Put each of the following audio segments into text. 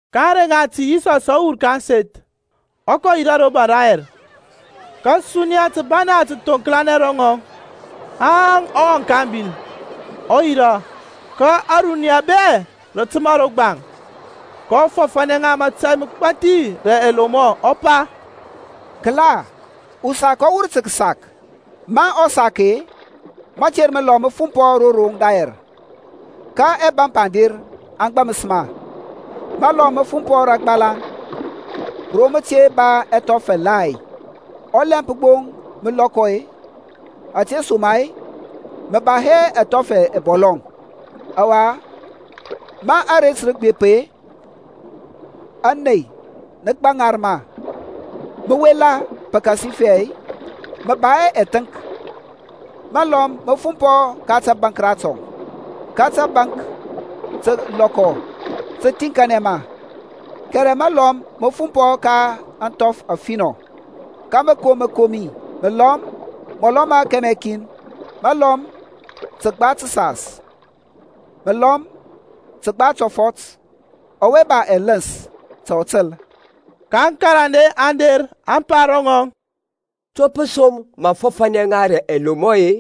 Ka ȧŋrey ŋati Yisɔs ɔ wur ka ȧŋseth, ɔ kɔ yirȧ ro baŋ rayɛr. Ka suniya tǝbana tǝ thoŋklanɛ ro ŋɔŋ, haŋ ɔ wɔŋ ka abil, ɔ yirȧ. Ka ȧruniya bɛ rǝ tǝma ro gbaŋ. kɔ fɔfȧnɛ ŋa mətȧy mǝgbathi rǝ ɛlomɔ, ɔ pa, Kǝla, usak ɔ wur tǝ kǝsak. Ma ɔ sak-e, mater mǝlɔm mǝ fumpɔ ro roŋ dayɛr, ka ɛbȧmp aŋ der aŋ gbȧmǝs ma. Mǝlɔm mǝ fumpɔ rǝ agbalaŋ, ro mǝ te ba ɛthɔf ɛgbathi. Ɔlɛmp gbo mǝ lɔkɔ-e, ȧtesoma-e mǝ ba hɛ ɛthɔf ɛbɔlɔŋ. Ɔwa ma aret rǝ gbep-e, ȧney nǝ gbaŋar ma, mǝ wela pǝkasifɛ mǝ ba hɛ ɛthǝnk. Mǝlɔm mǝ fumpɔ ka tȧbȧnk ratɔŋ, ka tȧbȧnk tǝ lɔkɔ, tǝ thiŋkanɛ ma. Kɛrɛ mǝlɔm mǝ fumpɔ ka ȧŋthɔf afinɔ, ka mǝ kom mǝkomi, mǝlɔm mɔlɔ ma kɛmɛ kin, mǝlɔm tǝgba tǝsas, mǝlɔm kǝgba tɔfɔt. Ɔwe ba ɛlǝns ta ɔ tǝl. Ka aŋkarande aŋ der aŋ pa ro ŋɔŋ, To pǝ som mǝ fɔfȧnɛ ŋa rǝ ɛlomɔ-e?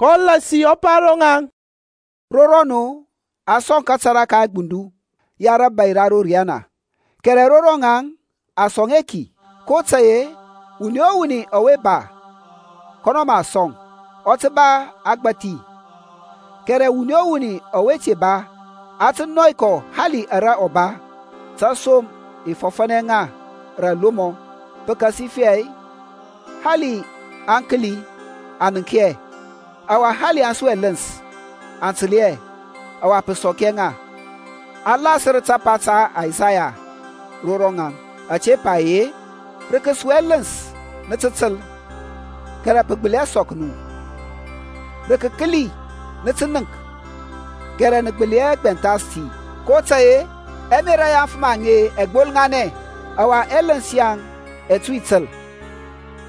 kɔ lasi ɔ pa ro ŋaŋ, Ro rɔnu a sɔŋ kȧtȧrȧ ka ɛgbundu ya rȧbȧy ra ro riyana, kɛrɛ ro rɔŋaŋ a sɔŋ hɛ ki. kotȧy-e wuni o wuni ɔwe ba, kɔnɔ mǝ a sɔŋ, ɔ tǝ ba agbȧthi, kɛrɛ wuni o wuni ɔwe te ba, a tǝ nɔy kɔ hali ara ɔ ba. Tȧsom i fɔfȧnɛ ŋa rǝ ɛlomɔ, pǝkasifɛ hali aŋ kǝli aŋ nənk hɛ, ɔwa hali aŋ su ɛlǝns aŋ tǝl hɛ, ɔwa pǝ sɔk hɛ ŋa. A lasǝr tapa ta Isaya ro rɔŋaŋ, ȧte pa ye, Rǝ kǝsu ɛlǝns nǝ tǝ tǝl, kɛrɛ pǝ gbǝli hɛ sɔk nu, Rǝ kǝkǝli nǝ tǝ nənk, kɛrɛ nǝ gbǝli hɛ gbɛnthas ti. kotȧy-e ɛmerȧ ya aŋfǝm aŋe ɛ gbolŋanɛ, Ɔwa ɛlǝns yaŋ ɛ tui tǝl,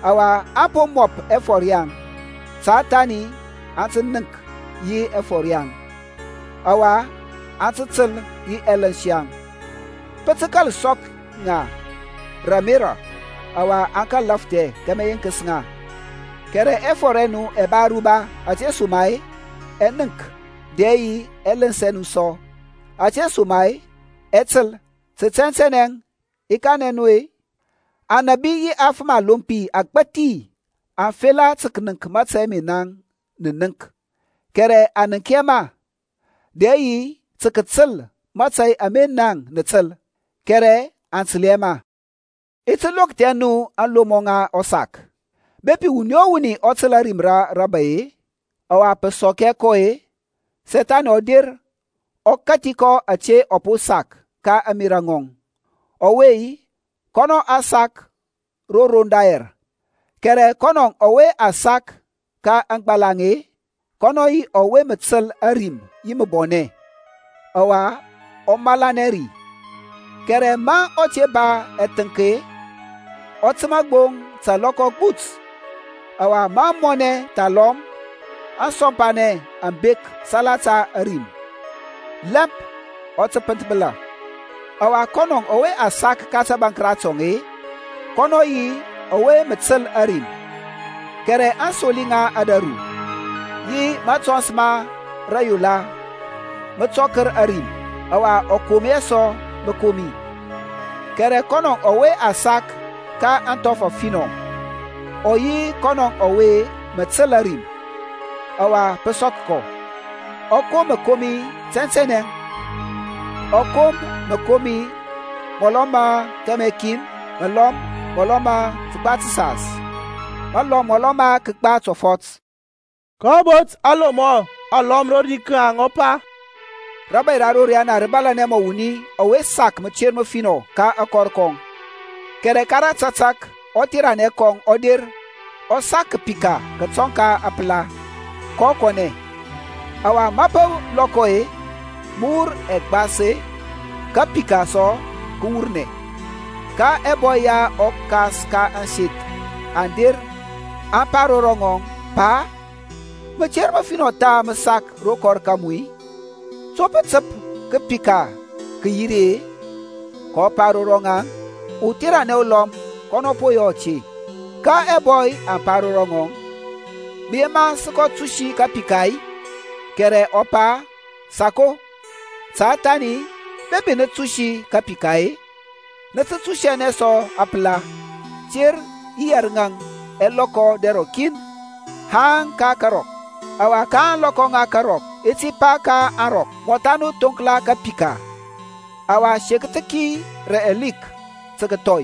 Ɔwa aŋ po mɔp ɛfɔr yaŋ, Ta thani aŋ ti nənk yi ɛfɔr yaŋ, Ɔwa aŋ tǝl yi ɛlǝns yaŋ, Pǝ tǝ kȧl sɔk ŋa rǝ ȧmerȧ, Ɔwa aŋ kȧl lafthɛ Kama, i yeŋkǝs ŋa. Kɛrɛ ɛfɔr ɛ nu ɛ ba aruba, ȧtesoma-e ɛ nənk, dɛ yi ɛlǝns ɛ nu sɔ, ȧtesoma-e ɛ tǝl. Tǝ tɛntɛnɛ i kanɛ nu-e, anȧbi yi afǝm alompi agbȧthi aŋ fela tǝ kǝnǝŋk mȧtȧy ama naŋ nǝ nənk kɛrɛ aŋ nənk hɛ ma: dɛ yi tǝ kǝtǝl mȧtȧy ama naŋ nǝ tǝl, kɛrɛ aŋ tǝl hɛ ma. I ti lokthɛ nu ȧŋlomɔ ŋa ɔsak. Bepi wuni o wuni ɔ tǝl ȧrim ra rabȧy-e, ɔwa pǝ sɔk hɛ kɔ-e, Sethani ɔ der, ɔ kathi kɔ ȧte a po sak ka ȧŋmerȧ ŋɔŋ. Ɔwe-e, kɔnɔ a sak ro roŋ dayɛr. Kɛrɛ kɔnɔ ɔwe a sak ka aŋgbalaŋ-e, kɔnɔ yi ɔwe mǝ tǝl ȧrim yi mǝbɔnɛ, ɔwa ɔ malanɛ ri. Kɛrɛ ma ɔ te ba athǝnk-e, ɔ tǝma gbo ta alɔkɔ agbut. Ɔwa ma mɔnɛ thalɔm asɔmpanɛ aŋ bek salata ȧrim, lɛmp ɔ tǝ pǝnthbǝla. Ɔwa kɔnɔ ɔwe a sak ka tabaŋk ratɔŋ-e, kɔnɔ yi ɔwe mǝ tǝl ȧrim, kɛrɛ aŋsoli ŋa ȧdȧru yi matɔns ma rȧyola mǝ tɔkǝr ȧrim, ɔwa ɔ kom hɛ sɔ mǝkomi. Kɛrɛ kɔnɔ ɔwe a sak ka ȧŋthɔf afinɔ ɔ yi kɔnɔ ɔwe mǝ tǝl ȧrim, ɔwa pǝ sɔk kɔ. Ɔ kom mǝkomi tɛntɛnɛ, kɔ kom mǝlɔm mɔlɔ ma kɛmɛ kin, mǝlɔm mɔlɔ ma tǝgba tǝsas, mǝlɔm mɔlɔ ma kǝgba tɔfɔt. kɔ bot alomɔ alɔm rodi ka ŋaŋ, ɔ pa, Rȧbȧy ra ro riyana rǝ bȧlȧnɛ mɔ wuni ɔwe sak mǝter mǝfinɔ ka akɔr kɔŋ, kɛrɛ ka tatak-e, ɔtheranɛ kɔŋ ɔ der ɔ sak kǝpika kǝtɔŋ apǝla, kɔ kɔnɛ. Ɔwa ma mǝ lɔkɔ-e, mǝ wur ɛgbas-e, kapika sɔ kǝ wurnɛ. Ka ɛbɔy ya ɔkas ka ȧŋseth aŋ der aŋ pa ro ŋɔŋ, Pa, mǝter mǝfinɔ tha mǝ sak ro kɔr kamu-i? To pǝ tǝp kǝpika kǝ yi ri-e? kɔ pa ro ŋaŋ, Utheranɛ ulɔm kɔnɔ po yɔ ȧte. Ka ɛbɔy aŋ pa ro ŋɔŋ, Mǝ yema sǝ kɔ tusi kapika-i? Kɛrɛ ɔ pa, Sako, ta thani bepi nǝ tusi kapika-e, nǝ tǝ tusianɛ sɔ apǝla. Ter yi yɛrǝŋȧŋ ɛ lɔkɔ dɛr ɔkin haŋ ka karɔk, ɔwa ka ȧŋlɔkɔ ŋa karɔk i ti pa ka aŋrɔk, Mɔtha nu thoŋkla kapika, ɔwa sekǝth ki rǝ ɛlik tǝ kǝthɔy.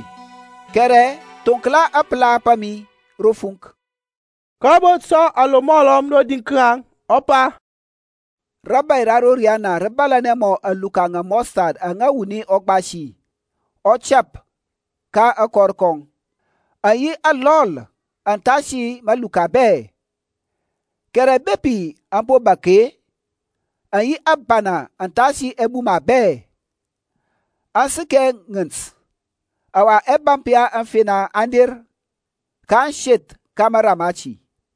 Kɛrɛ thoŋkla apǝla pa mi ro fuŋk. kɔ bot sɔ alomɔ alɔm rodi ka ŋaŋ, ɔ pa, Rȧbȧy ra ro riyana rǝ bȧlȧnɛ mɔ aluka ŋa amustard aŋa wuni ɔ gbasi, ɔ tɛp ka akɔr kɔŋ. Aŋ yi alɔl athasi maluka bɛ, kɛrɛ bepi aŋ po bȧk-e, aŋ yi ȧbana athasi ɛbuma bɛ, aŋ sǝkɛ ŋǝnt, ɔwa ɛbȧmp ya aŋfena aŋ der, kaŋ seth ka mara mati.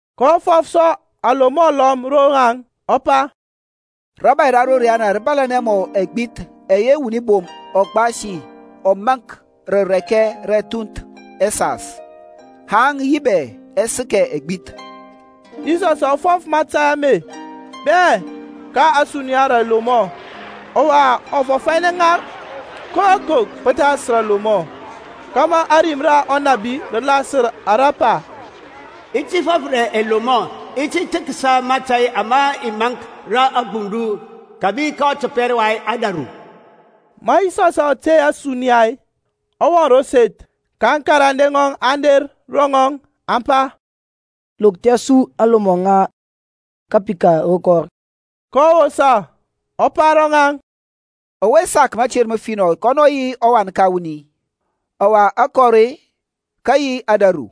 kɔ fɔf sɔ alomɔ alɔm ro ŋaŋ, ɔ pa, Rȧbȧy ra ro riyana rǝ bȧlȧnɛ mɔ ɛgbith ɛyɛ wuni bom ɔ gbasi ɔ maŋk rǝ rɛkɛ ra ɛthunth ɛsas, haŋ yi bɛ ɛ sǝkɛ ɛgbith. Yisɔsȧŋ ɔ fɔf mȧtȧy ame bɛ ka ȧsuniya rǝ ɛlomɔ, ɔwa ɔ fɔfȧnɛ hɛ ŋa koko pǝthas rǝ alomɔ, kȧmȧ ȧrim ra ɔnȧbi rǝ lasǝr ara pa, I ti fɔf rǝ ɛlomɔ, I ti thǝksa mȧtȧy ama a maŋk rǝ agbundu kǝbi ka ɔtɔpɛr wa ȧdȧru. Ma Yisɔsȧŋ ɔ tey ȧsuniya-e, ɔ wɔŋ ro seth, ka aŋkarande ŋɔŋ aŋ der ro ŋɔŋ aŋ pa, Lokthia su aŋlomɔ ŋa kapika ro kɔr. kɔ wosa, ɔ pa ro ŋaŋ, Ɔwe sak mater mǝfinɔ kɔnɔ yi ɔWan ka wuni. Ɔwa akɔr-e, kǝ yi ȧdȧru.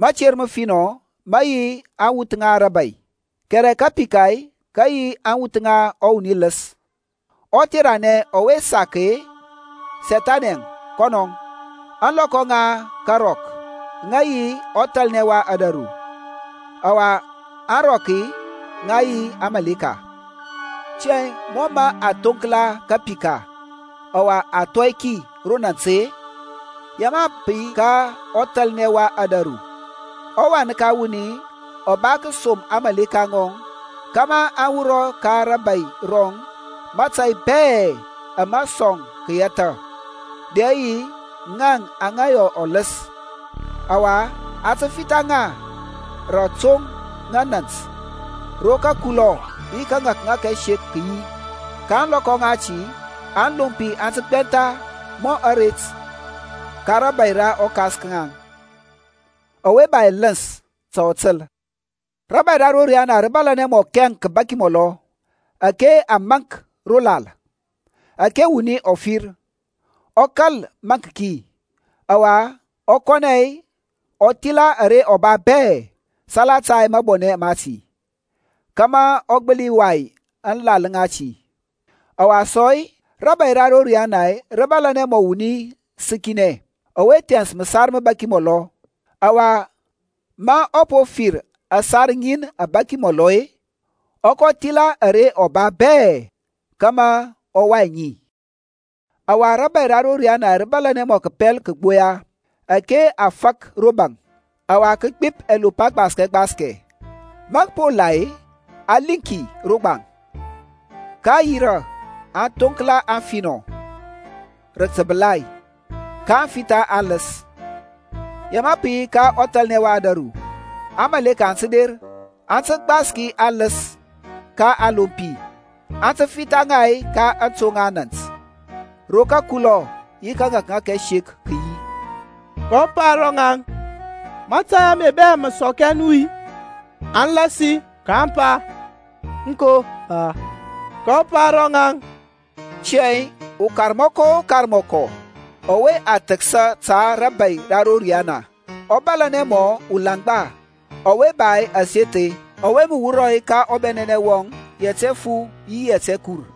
Mater mǝfinɔ mǝ yi aŋwuth ŋa rȧbȧy, kɛrɛ kapika kǝ yi aŋwuth ŋa ɔwuni lǝs. Ɔtheranɛ ɔwe sak ki-e, Sethani kɔnɔȧŋ. Ȧŋlɔkɔ ŋa karɔk aŋ yi ɔthalnɛ wa ȧdȧru, ɔwa aŋrɔk, ŋa yi aŋmȧleka. Tiyȧŋ mɔ mǝ a thoŋkla kapika, ɔwa a thɔi ki ro nant-e, ya mǝ pǝ yi ka ɔthalnɛ wa ȧdȧru. ƆWan ka wuni ɔ ba kǝsom aŋmȧleka ŋɔŋ kȧmȧ aŋ wurɔ ka rȧbȧy rɔŋ matȧy bɛ ama sɔŋ kǝyɛthȧ, dɛ yi ŋaŋ aŋa yɔ ɔlǝs. Ɔwa a tǝ fitha ŋa rǝ atoŋ ŋa nȧnt ro kǝkulɔ yi kȧŋȧkŋȧk ɛsek kǝ yi. Ka ȧŋlɔkɔ ŋati aŋlompi aŋ tǝ gbɛntha mɔ aret ka rȧbȧy ra ɔKas ka ŋaŋ. Ɔwe ba ɛlǝns ta ɔ tǝl. Rȧbȧy ra ro riyana rǝ bȧlȧnɛ mɔ kɛŋ kǝbaki mɔlɔ ȧke a maŋk ro lal, ȧke wuni ɔ fir, ɔ kȧl maŋk ki, ɔwa ɔ kɔnɛ ɔ thila ara ɔ ba bɛ salata mabɔnɛ mati, kȧmȧ ɔ gbǝli wai aŋlal ŋati. Ɔwa sɔ-e, rȧbȧy ra ro riyana rǝ bȧlȧnɛ mɔ wuni sǝkinɛ ɔwe thɛns mǝsar mǝbaki mɔlɔ. Ɔwa ma ɔ po fir ȧsar ŋin abȧki mɔlɔ-e, ɔ kɔ thila ara ɔ ba bɛ-e, kȧmȧ ɔ wai ŋi. Ɔwa rȧbȧy ra ro riyana rǝ bȧlȧnɛ sɔ mɔ kǝpɛl kǝgboya ȧke a fak ro baŋ, ɔwa kǝ gbip ɛlop agbaskɛ gbaskɛ. Ma kǝ po la-e, a liŋ ki ro gbaŋ, kaŋ yirȧ aŋ thoŋkla aŋfinɔ rǝ tǝbǝlai, kaŋ fitha aŋlǝs. Ya mǝ pǝ yi ka ɔthalnɛ wa ȧdȧru. Aŋmȧleka aŋ tǝ der, aŋ tǝ gbaski aŋlǝs ka aŋlompi, aŋ tǝ fitha ŋa ka aŋtoŋ ŋa nȧnt, ro kǝkulɔ yi kȧŋȧkŋȧk ɛsek kǝ yi. Kɔ pa ro ŋaŋ, Mȧtȧy ame bɛ mǝ sɔk nu-i? Aŋ lasi, kaŋ pa, Aŋko, Pa. Kɔ pa ro ŋaŋ, Tiyȧŋ ukarmɔkɔ o karmɔkɔ ɔwe a thǝksa ta rȧbȧy ra ro riyana ɔ bȧlȧnɛ mɔ ulaŋgba ɔwe ba aseth-e, ɔwe mǝ wur ka ɔbɛnɛnɛ wɔŋ yɛt ɛfu yi yɛt ɛkur.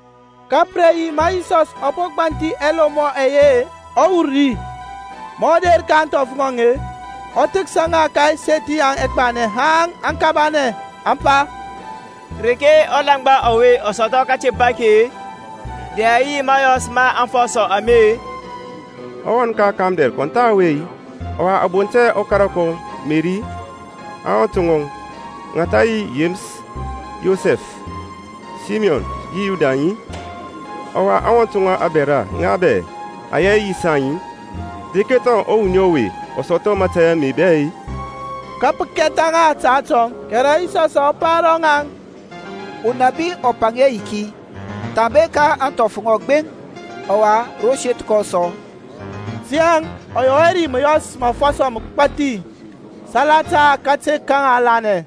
Ka pǝ re yi ma Yisɔs ɔ po gbanthi ɛlomɔ ɛye-e, ɔ wur ri. Ma ɔ der ka ȧŋthɔf ŋɔŋ-e, ɔ thǝksa ŋa ka ȧŋseth ŋaŋ agbanɛ haŋ aŋ kabanɛ, aŋ pa, Reke ɔlaŋgba ɔwe ɔ sɔthɔ kȧtemp ake, dɛ yi mȧyɔs ma afɔsɔ ame-e? Ɔwan ka ɔkamdɛr kɔn tha ɔwe-i? Ɔwa a bont hɛ ɔkara kɔŋ Meri-i? Aŋwɔnt ŋɔŋ, ŋa tha yi Yemǝs, Yosef, Saymɔn yi Yudaŋ-i? Ɔwa aŋwɔnt ŋɔŋ abɛra ŋa bɛ aŋ yi hɛ yi saŋ-i? Reke thɔŋ ɔwuni ɔwe ɔ sɔthɔ mȧtȧy ame bɛ-e? Ka pǝ kɛtha ŋa ta atɔŋ. Kɛrɛ Yisɔsȧŋ ɔ pa ro ŋaŋ, Unabi ɔ paŋ hɛ ayiki, thambe ka ȧŋthɔf ŋɔŋ gbeŋ, ɔwa ro seth kɔŋ sɔ. Tiyȧŋ ɔ yɔ hɛ ri mǝyɔs ma afɔsɔ mǝgbathi salata kate ka ŋaŋ lanɛ.